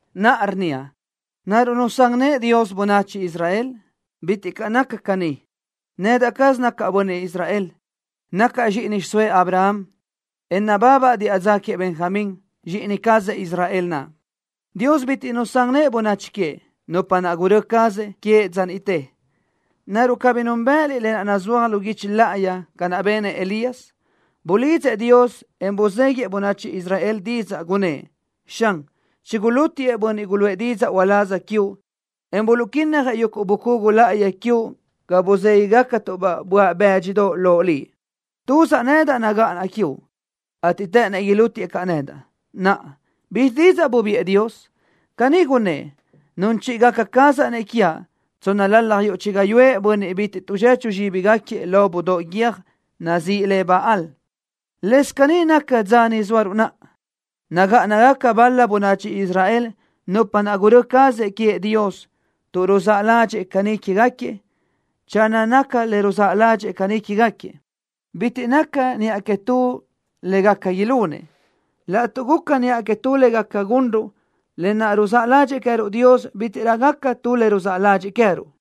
Naʼa rnníaʼ: ¿Naruʼ nusán nëʼë Dios bönachi Israel? ¡Bitiʼ caʼ naca caní! Nedaʼ caz nacaʼ bönniʼ Israel. Nacaʼ zxíʼini xiʼsóëʼ Abraham, en nababaʼ diʼa dza queëʼ Benjamín, zxíʼini cazëʼ Israel naʼ. Dios bitiʼ nusán nëʼë bönachi queëʼ, nupa naʼ gurö́ cazëʼ queëʼ dza niʼte. ¿Naruʼ cabí núnbëʼëliʼ lë naʼ nazúaj lu guichi láʼayi ca naʼ benëʼ Elías? Bulidzëʼ Dios, en buzéguiëʼ bönachi Israel didzaʼ, gunnë́ʼ: “Xan, chigulútiëʼ bönniʼ guluʼë didzaʼ uláz quiuʼ, en buluʼquinnajëʼ yuguʼ bucugu láʼayi quiuʼ ga buzéguigacatuʼ-baʼ böaʼ bë́dxidoʼ loʼ Liʼ. Tuzaʼ nedaʼ nagáʼanaʼ quiuʼ, ateʼ të́ʼënnëʼ ilútiëʼ caʼ nedaʼ.” Naʼa, ¿bizxi didzaʼ bubiʼë Dios? Caní gunnë́ʼ: “Nun chíʼigaca cazaʼ-nëʼ quiaʼ tsónnalalaj yuʼ chi gáyuʼë bönniʼ bitiʼ tuʼzechu zxíbigaquiëʼ lo budóʼ guiö́j naʼ nazíʼi le Baal.” Lëscaʼ caní naca dza ni zóaruʼ naʼa, nagáʼanagaca bal-la bönachi Israel, nupa naʼ gurö́ cazëʼ queëʼ Dios tuʼ ruzáʼ ládxëʼë caní quégaquiëʼ. Channö naca le ruzáʼ ládxëʼë caní quégaquiëʼ, bitiʼ naca niʼa que tu le gaca ilunëʼ. Laʼtuʼ guca niʼa que tu le gaca gunruʼ, lë naʼ ruzáʼ ládxëʼë queë́ruʼ Dios bítiʼrö gaca tu le ruzáʼ ládxëʼë queë́ruʼ.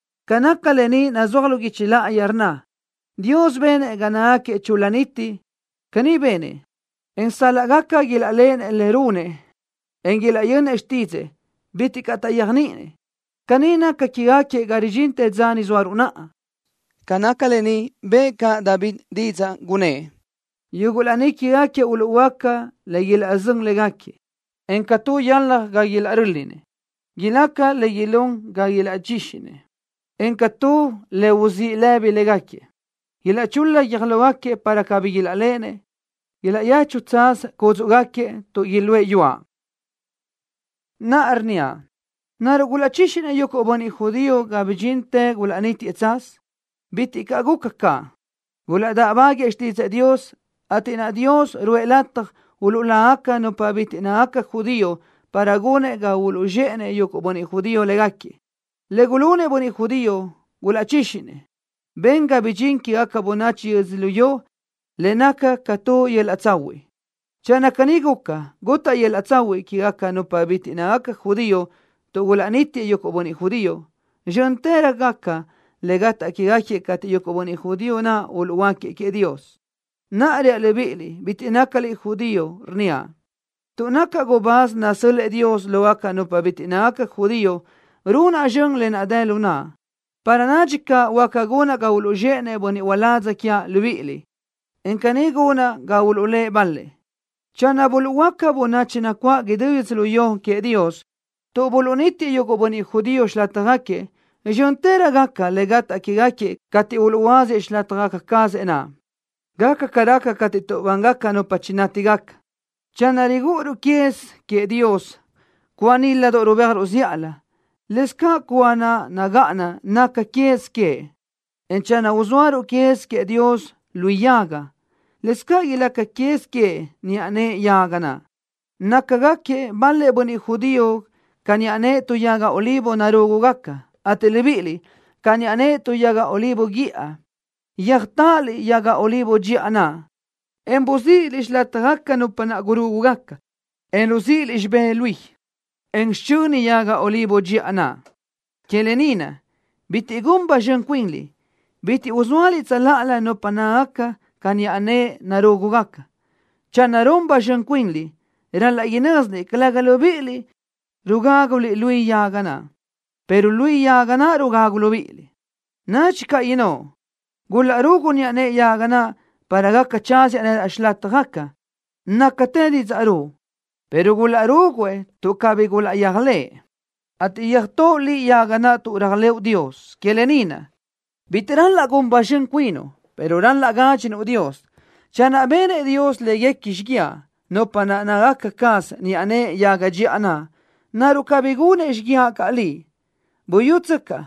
Ca naca lë ni nazúaj lu guichi láʼayi, rnna: “Dios benëʼ ga nácagaquiëʼ chul-la niti.” Caní benëʼ, en sal-laʼ gaca ilaʼléʼenëʼ le runëʼ, en ilaʼyönnëʼ xtídzëʼë, bitiʼ caʼ taʼyéajniʼinëʼ. Caní naca quégaquiëʼ ga ridxintë dza ni zóaruʼ naʼa. Ca naca lë ni bëʼë caʼ David didzaʼ, gunnë́ʼ: Yuguʼ laní quégaquiëʼ uluʼhuöáca le ilaʼzö́n légaquiëʼ, en ca tu yalaj ga ilaʼrö́linëʼ. Ilaca caʼ le ilún ga ilaʼchíxinëʼ, en ca tu le uzíʼ lëbi légaquiëʼ. Ilaʼchul-la guiö́j lógaquiëʼ, para cabí ilaʼléʼenëʼ. Ilaʼyechu tsaz cúdzuʼgaquiëʼ tuʼ iluʼë yuaʼ. Naʼa rnníaʼ: ¿Naruʼ gulaʼchíxinëʼ yuguʼ bönniʼ judío ga bidxintë gulaʼnítiëʼ tsaz? ¡Bitiʼ caʼ guca caʼ! Gulaʼdáʼbaguëʼë xtídzëʼë Dios, ateʼ naʼa Dios ruʼë lataj uluʼlágaca nupa bitiʼ nácagaca judío para gunëʼ ga uluʼzxéʼenëʼ yuguʼ bönniʼ judío léguequi. Le gulunëʼ bönniʼ judío, gulaʼchíxinëʼ, ben ga bidxín quégaca bönachi yödzölió ni le naca ca tu yöl-laʼ tsahuiʼ. Channö caní guca, gutaʼ yöl-laʼ tsahuiʼ quégaca nupa bitiʼ nácagaca judío tuʼ gulaʼnítiëʼ yuguʼ bönniʼ judío, zxö́ntërö gaca le gataʼ quéguequi cateʼ yuguʼ bönniʼ judío naʼ uluʼhuöáquiëʼ queëʼ Dios. Naʼa reaʼ libíʼiliʼ bitiʼ nácaliʼ judío, rnníaʼ: Tuʼ nacaʼ gubáz nasö́l-lëʼë Dios lógaca nupa bitiʼ nácagaca judío, runaʼ zxön lë naʼ dë lu naʼa para nadxi caʼ huáca gunaʼ ga uluʼzxéʼenëʼ bönniʼ uládz quiaʼ libíʼiliʼ, en caní gunaʼ ga uluʼlë́ʼ bal-lëʼ. Channö buluʼhuöáca bönachi nacuáʼ idú yödzölió queëʼ Dios tuʼ buluʼnítiëʼ yuguʼ bönniʼ judío xilátjagaquiëʼ, zxö́ntërö gaca le gataʼ quéguequi cateʼ uluʼhuöáziëʼ xilátjagaca cazëʼ naʼ. Gaca ca raca cateʼ tuʼbángaca nupa chinátigaca. Channö rigúʼuruʼ quez queëʼ Dios cúa níladoʼ rubéajruʼ zíʼalö, lëscaʼ cúa naʼ nagáʼana naca quez queëʼ, en channö uzóaruʼ quez queëʼ Dios luí yaga, lëscaʼ ilaca quez queëʼ niʼa nëʼe yaga naʼ. Nácagaquiëʼ bal-lëʼ bönniʼ judío ca niʼa nëʼe tu yaga olivo narúgugaca, ateʼ libíʼiliʼ, ca niʼa nëʼe tu yaga olivo guíʼa, yöjtáʼaliʼ yaga olivo dxiʼa naʼ, en buáziliʼ xilátjagaca nupa naʼ gurúgugaca, en ruzíʼiliʼ xibé luí, en xichöni yaga olivo dxiʼa naʼ. Que lë ni naʼ, bitiʼ gun ba zxön cuinliʼ, bitiʼ uzóaliʼ tsöláʼalö nupa nácagaca ca niʼa nëʼe naʼ narúgugaca. Channö run ba zxön cuinliʼ, ral-laʼ inö́ziliʼ calëga libíʼiliʼ rugáguliʼ luí yaga naʼ, pero luí yaga naʼ rugagu libíʼiliʼ. Nadxi caʼ innóʼ: “Gulaʼrugu niʼa nëʼe yaga naʼ para gaca tsáziaʼ nedaʼ xilátjagaca.” Nácatë didzaʼ ruʼu, pero gulaʼrúguiëʼ tuʼ cabí gulaʼyéajlëʼë, ateʼ yöjtóʼo liʼ yaga naʼ tuʼ réajlëʼu Dios. Que lë ni naʼ, bitiʼ ral-laʼ gun ba zxön cuinuʼ, pero ral-laʼ gádxinuʼ Dios. Channö benëʼ Dios léguequi xíguiaʼ, nupa naʼ nácagaca caz niʼa nëʼe yaga dxiʼa naʼ, ¿naruʼ cabí gunëʼ xíguiaʼ caʼ liʼ? Buyútsöcaʼ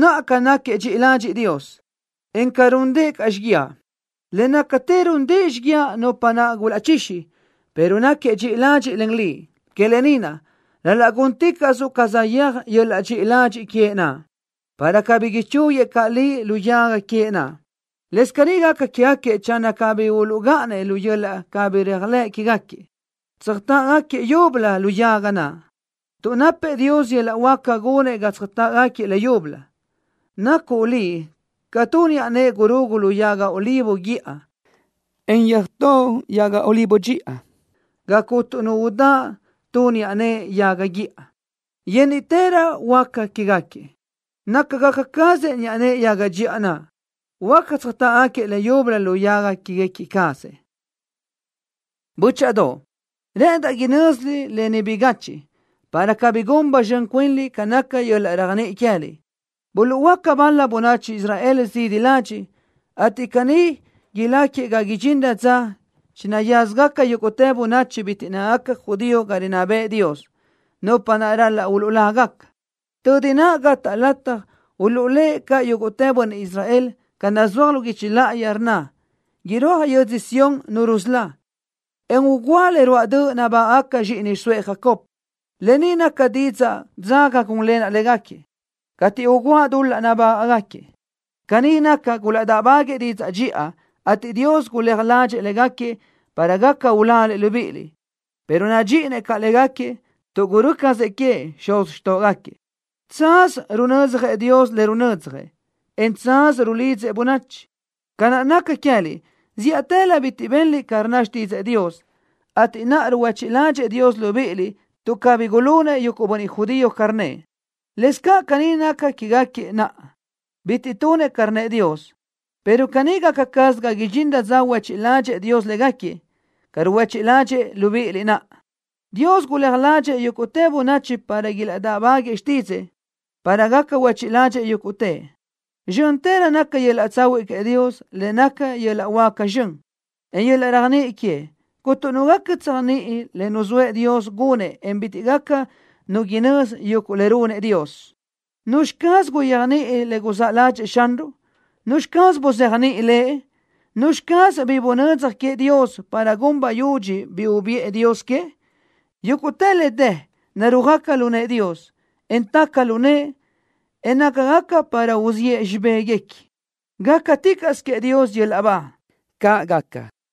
naʼa ca náquiëʼ dxiʼi ladxiʼ Dios, en ca rúndëʼë caʼ xíguiaʼ. Le nácatë rúndëʼë xíguiaʼ nupa naʼ gulaʼchixi, pero náquiëʼ dxiʼi ladxiʼ len liʼ. Que lë ni naʼ, ral-laʼ gúnticaʼsuʼ ca saʼyéaj yöl-laʼ dxiʼi ladxiʼ queëʼ naʼ, para cabí ichúguiëʼ caʼ liʼ lu yaga queëʼ naʼ. Lëscaʼ caní gaca quégaquiëʼ channö cabí uluʼgáʼanëʼ lu yöl-laʼ cabí réajlëʼ quégaquiëʼ, tsöjtáʼgaquiëʼ leyúbölö lu yaga naʼ, tuʼ napëʼ Dios yöl-laʼ huáca gunëʼ ga tsöjtáʼgaquiëʼ le leyúbölö. Nacuʼ liʼ ca tu niʼa nëʼe gurugu lu yaga olivo guíʼa, en yöjtóʼo yaga olivo dxiʼa ga cuntu nu udáʼ tu niʼa nëʼe yaga guíʼa. Yénniʼtërö huáca quégaquiëʼ, nácagaca cazëʼ niʼa nëʼe yaga dxiʼa naʼ, huáca tsöjtáʼgaquiëʼ leyúbölö lu yaga quéguequi cazëʼ naʼ. Bö́chaʼadoʼ, rë́ʼëndaʼ inö́ziliʼ lë ni bigachiʼ, para cabí gun ba zxön cuinliʼ ca naca yöl-laʼ réajniʼi queë́liʼ. Buluʼhuöáca bal-la bönachi Israel zidi ladxiʼ, ateʼ caní iláquiëʼ ga idxinrö dza chinayázgaca yúguʼtë bönachi bitiʼ nácagaca judío ga rinná bëʼë Dios, nupa naʼ ral-laʼ uluʼlágaca. Tödi naʼ gataʼ lataj uluʼlë́ʼ caʼ yúguʼtë bönniʼ Israel, ca naʼ nazúaj lu guichi láʼayi, rnna: Irúaj yödzö Sión Nu rusölá, en ugúa le ruáʼ döʼ nabágaʼgaca zxíʼini xiʼsóëʼ Jacob. Lë ni naca didzaʼ dzaga gúnlenaʼ légaquiëʼ cateʼ ugúaʼ dul-laʼ nabágaʼgaquiëʼ. Caní naca, gulaʼdáʼbaguëʼë didzaʼ dxiʼa, ateʼ Dios guléaj ládxëʼë légaquiëʼ para gaca uláliʼ libíʼiliʼ, pero nadxíʼinëʼ caʼ légaquiëʼ, tuʼ gurö́ cazëʼ queëʼ xuz xtóʼogaquiëʼ. Tsaz runödzjëʼ Dios le runödzjëʼ, en tsaz rulidzëʼ bönachi. Ca naʼ naca queë́liʼ, zíʼatëlö bitiʼ benliʼ ca rnna xtídzëʼë Dios, ateʼ naʼa ruhuéchiʼ ládxëʼë Dios libíʼiliʼ tuʼ cabí gulunëʼ yuguʼ bönniʼ judío ca rnnëʼ. Lëscaʼ caní naca quégaquiëʼ naʼa, bitiʼ tunëʼ ca rnnëʼ Dios, pero caní gácasö ga idxinrö dza huéchiʼ ládxëʼë Dios légaquiëʼ, ca ruhuéchiʼ ládxëʼë libíʼiliʼ naʼa. Dios guléaj ládxëʼë yúguʼtë bönachi para ilaʼdáʼbaguëʼë xtídzëʼë, para gaca huéchiʼ ládxëʼë yúguʼtëʼ. Zxö́ntërö naca yöl-laʼ tsahuiʼ queëʼ Dios, lë naʼ naca yöl-laʼ huáca zxön, en yöl-laʼ réajniʼi queëʼ. Cuntu nu gaca tséajniʼi le nuzóëʼ Dios gunëʼ, en bitiʼ gaca nu inözi yuguʼ le runëʼ Dios. ¿Nuzxi caz guyéajniʼi le guzáʼ ládxëʼë Xanruʼ? ¿Nuzxi caz buzéajniʼi Lëʼ? ¿Nuzxi caz bi bunödzaj queëʼ Dios para gun bayudxi bi ubiʼë Dios que? Yúguʼtë le dë narúajgaca lu nëʼë Dios, en taca lu nëʼë, en nácagaca para uziʼë xibéguequi. ¡Gácaticaʼsö queëʼ Dios yöl-laʼ ba! ¡Caʼ gaca!